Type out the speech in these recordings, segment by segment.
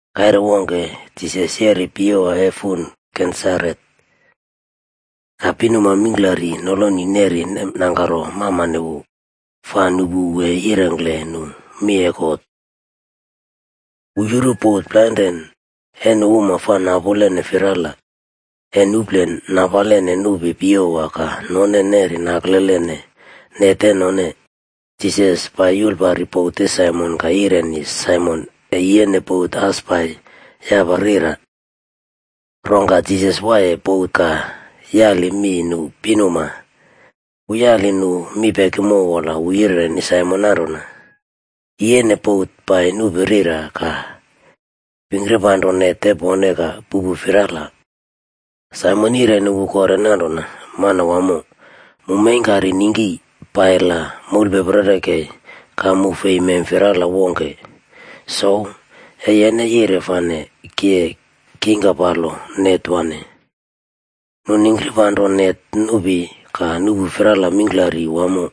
Kaire wongke, Jisas yeriye piyewa e fun Genesaret,a ka pinuma mingklari noloni neri nemnangkaro mamane wu, fa nupu wu e yirengkle nu mi e God. Wu yuru bot plainrane e nu uma fa napulene firala, e nuplen napalene nupi piyewa ka none neri naklelene net e none. Jisas pai yulpari bot e Saimon ka yireni Saimon e yiyene bot as pai yapa rira. Rongka Jisas waiye bot ka yali mi nu pinuma. Wu yali nu mi pekimo wola wu yireni Saimon nanrona, “Yiyene bot pai nupi rira ka pingkipanro net e pone ka puꞌpu firala.” Saimon yireni wu kore nanrona, “Manwamo, mu meingkari ningki, pai la moulpeperi kei ka mu fei mem firala wongke. Souw, e yen yire fane ki e kingkirpanro net wane.” Nu ningkipanro net nupi, ka nuꞌpu firala mingklari wamo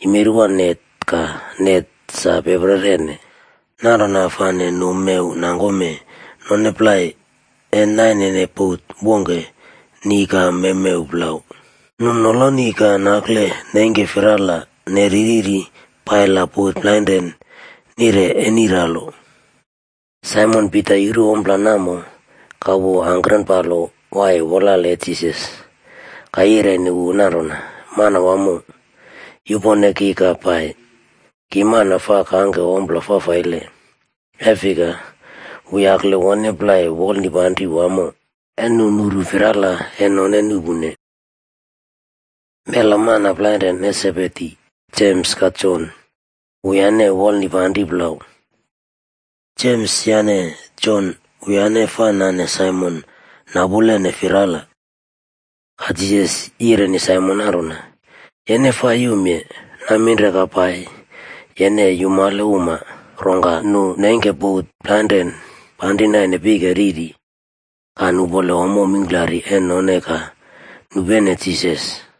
yimerwa net ka net sa peprerene. Nanrona fane nu mew nangkome none plai e nainene bot wongke ni ka mewmew plau. Nu noloni ka nakle neingke firala neri riri pai la bot plainrane nire eniralo. Saimon Pita yuru ompla namo, ka wu angkrenpalo waiye wolale e Jisas ka yireni wu nanrona, “Manwamo, yupone ki ka pai, ki mana fa kangke ommo fafaile.” E fika wu yakle wone plai wolnipanrini wamo, e nu nuru firala e none nuꞌpune. Mela mana plainren e Sebedi, Jems ka Jon, wuyane wolnipanri plau. Jems yane Jon, wuyane fa nane Saimon napulene firala. Ka Jisas yireni Saimon nanrona, “Yene fa yumye. Naminre ka pai, yene e yumale uma.” Rongka nu neingke bot plainrane panri naine pike riri, ka nupole ommo mingklari e none ka nupene Jisas.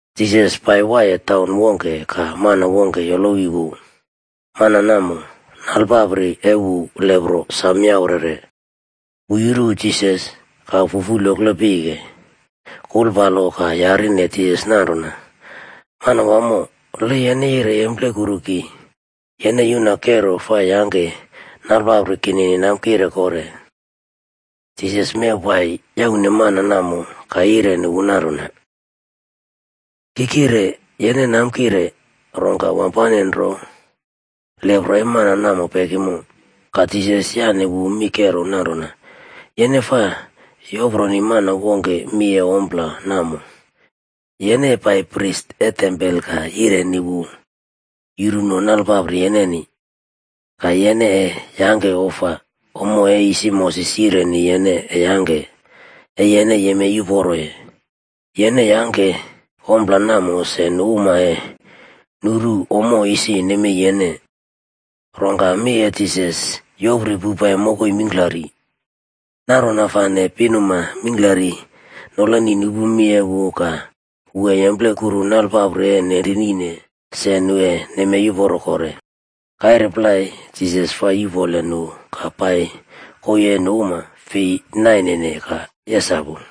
Jisas pai waiye taun wongke ka mana wongke yolowi wu. Mana namo, nalpapri e wu lepro sam yaurere. Wu yuru Jisas, ka fufulyokle pike, kulpalo ka yarine Jisas nanrona, “Manwamo, le yene yire yemplekuru ki, yene yuna kero fa yangke nalpapri kinini namkireb kore.” Jisas mew pai yaune mana namo ka yireni wu nanrona, “Ki kire. Yene namkire.” Rongka wampane nro lepro e mana namo pekimo. Ka Jisas yaꞌne wu mi kero nanrona, “Yene fa yoproni mana wongke mi e ompla namo. Yene e pai pris e tempol ka yireni wu yuruno nalpapri yeneni, ka yene e yangke ofa, ommo e isi Moses yireni yene e yangke, e yene yemei uporoye. Yene yangke ompla namo se nu uma e nuru ommo isi nemei yene.” Rongka mi e Jisas yopri poupai mokoi mingklari. Nanrona fane pinuma mingklari noloni nupu mi e wu ka wu e yemplekuru nalepapri e nenrinine se, nu e nemei uporo kore. Kaire plai Jisas fa yupole nu ka pai koii e nu uma fei nainene ka yesapuye.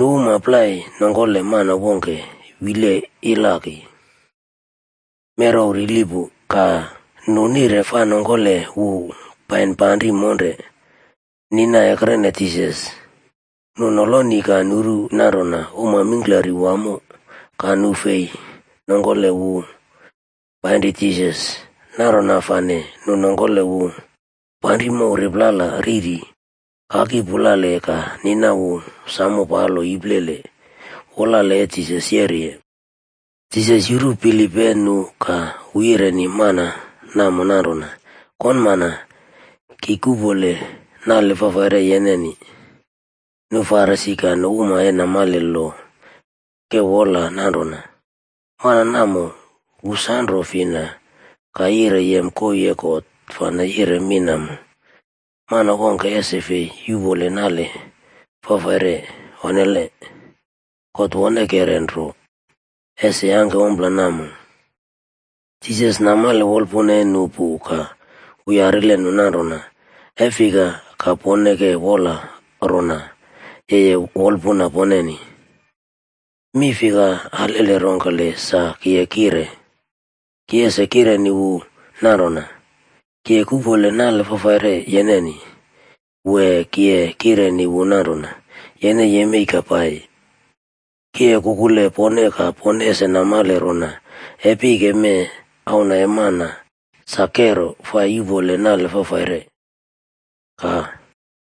Nu uma plai nongkole mana wongke wiye ilaki, merew rili pu, ka nu nire fa nongkole wu painri panri monre, nina ekrene Jisas. Nu noloni ka nuru nanrona uma mingklari wamo ka nu fei nongkole wu painri Jisas, nanrona fane nu nongkole wu panri mow riplala riri, kaki pulale ka nina wu sam palo iplele, wolale e Jisas yeriye. Jisas yuru bilip e nu ka wu yireni mana namo nanrona, “Konmana, ki kuꞌpole nale fafaire yeneni.” Nu Farisi ka nu uma e namale loc ke wola nanrona, “Mana namo wu sanro fina ka yire yem koii e God fane yire mi namo? Mana wongke ese fi yuꞌpole nale fafaire. Onnele. God wonkere nro, ese yangke ompla namo.” Jisas namale wolpuna e nu pu ka wu yarile nu nanrona, “E fika ka pone ke wola rona, yeye wolpuna poneni? Mi fika alele rongkele sa ki e kire? Ki ese kireni wu nanrona, ‘Ki kuꞌpole nale fafaire yeneni’, wee ki e kireni wu nanrona, ‘Yene yemei ka pai’? Ki e kukule pone ka pone ese namale rona, e pike mee, Auna e Mana sa kero fa yuꞌpole nale fafaire.” Ka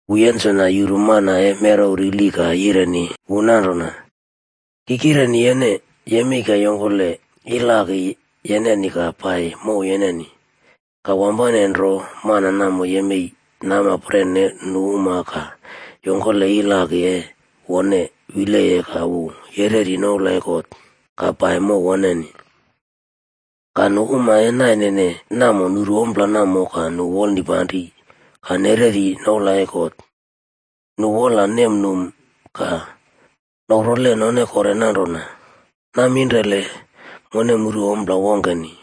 wu yensona yuru mana e merew rili ka yireni wu nanrona, “Ki kireni yene, yemei ka yongkole ilaki yeneni ka pai mow yeneni.” Ka wampane nro mana namo yemei namapren e nu uma ka yongkole ilaki e wone wileye ka wu yereri noula e God ka pai mow woneni. Ka nu uma e nainene namo nuru ompla namo ka nu wolnipanri ka nereri noula e God. Nu wola numnum ka noprole none kore nanrona, “Naminrele mone muru ompla wongkeni!”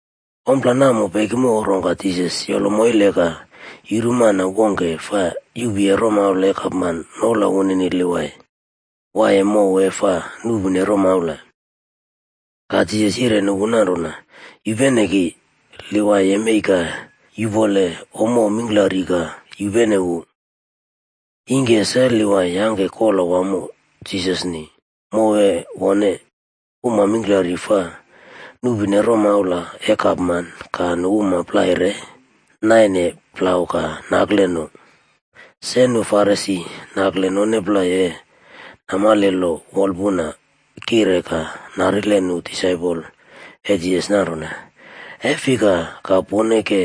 Ommo namo pekimo rongka Jisas yolo moile ka yuru mana wongke fa yuꞌpuye romaula e gapman noula wunini Livai,d waiye mow e fa nuꞌpune romaula. Ka Jisas yireni wu nanrona, “Yupene ki.” Livai yemei ka yupole ommo mingklari ka yupene wu. Ingke se Livai yangke kola wamo Jisasni, mow e wone. Uma mingklari fa nuꞌpune romaula e gapman ka nu uma plai re naine plau ka nakle no. Se nu Farisi nakle none plai e namale lo wolpuna kire ka narile nu disaipole e Jisas nanrona, “E fika ka pone ke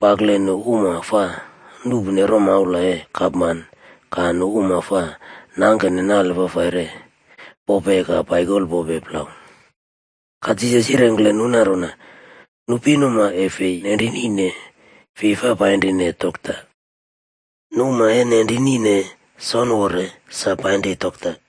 pakle nu uma fa nuꞌpune romaula e gapman ka nu uma fa nangkene nale fafaire pope ka paikolpope plau?” Ka Jisas yirengkle nu nanrona, “Nu pinuma e fei nenrinine fi fa painrine dokta. Nu uma e nenrinine, sonore sa painri dokta.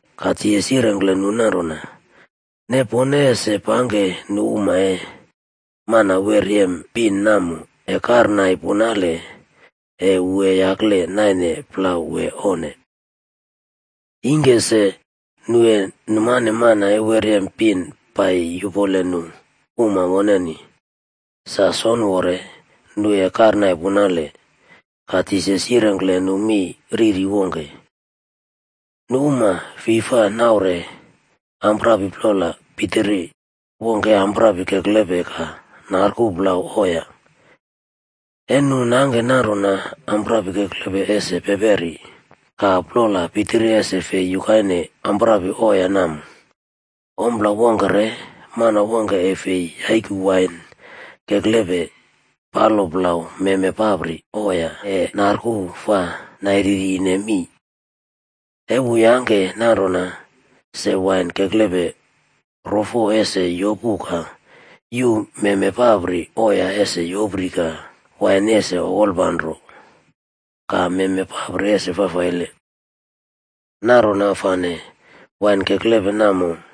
Ka Jisas yirengkle nu nanrona, “Ne pone ese pangke nu uma e mana wer yem pin namo e karnai punale, e wu yakle naine plau wee, onne? Ingke se, nu e numane mana e wer yem pin pai yupole nu uma woneni, sa sonore, nu e karnai punale.” Ka Jisas yirengkle nu mi riri wongke: “Nu uma fi fa naure amprapi plol pitiri wongke e amprapi keklepe ka narku plau oya. E nu nangke nanrona amprapi keklepe ese peperi, ka plol pitiri ese fei yukaine amprapi oya namo. Ompla wongke re, mana wongke e fei yaiku wain keklepe palo plau meme papri oya e narku fa nairirine mii. E wu yangke nanrona, se wain keklepe rofo ese yopu ka yuu meme papri oya ese yopri ka wain ese okolpanro ka meme papri ese fafaile. Nanrona fane wain keklepe namo,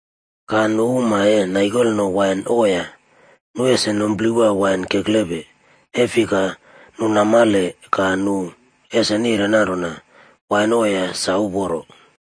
Ka nu uma e naikolno wain oya, nu ese numplewa wain keklepe, e fika nu namale ka nu ese nire nanrona, ‘Wain oya sa uporo.’”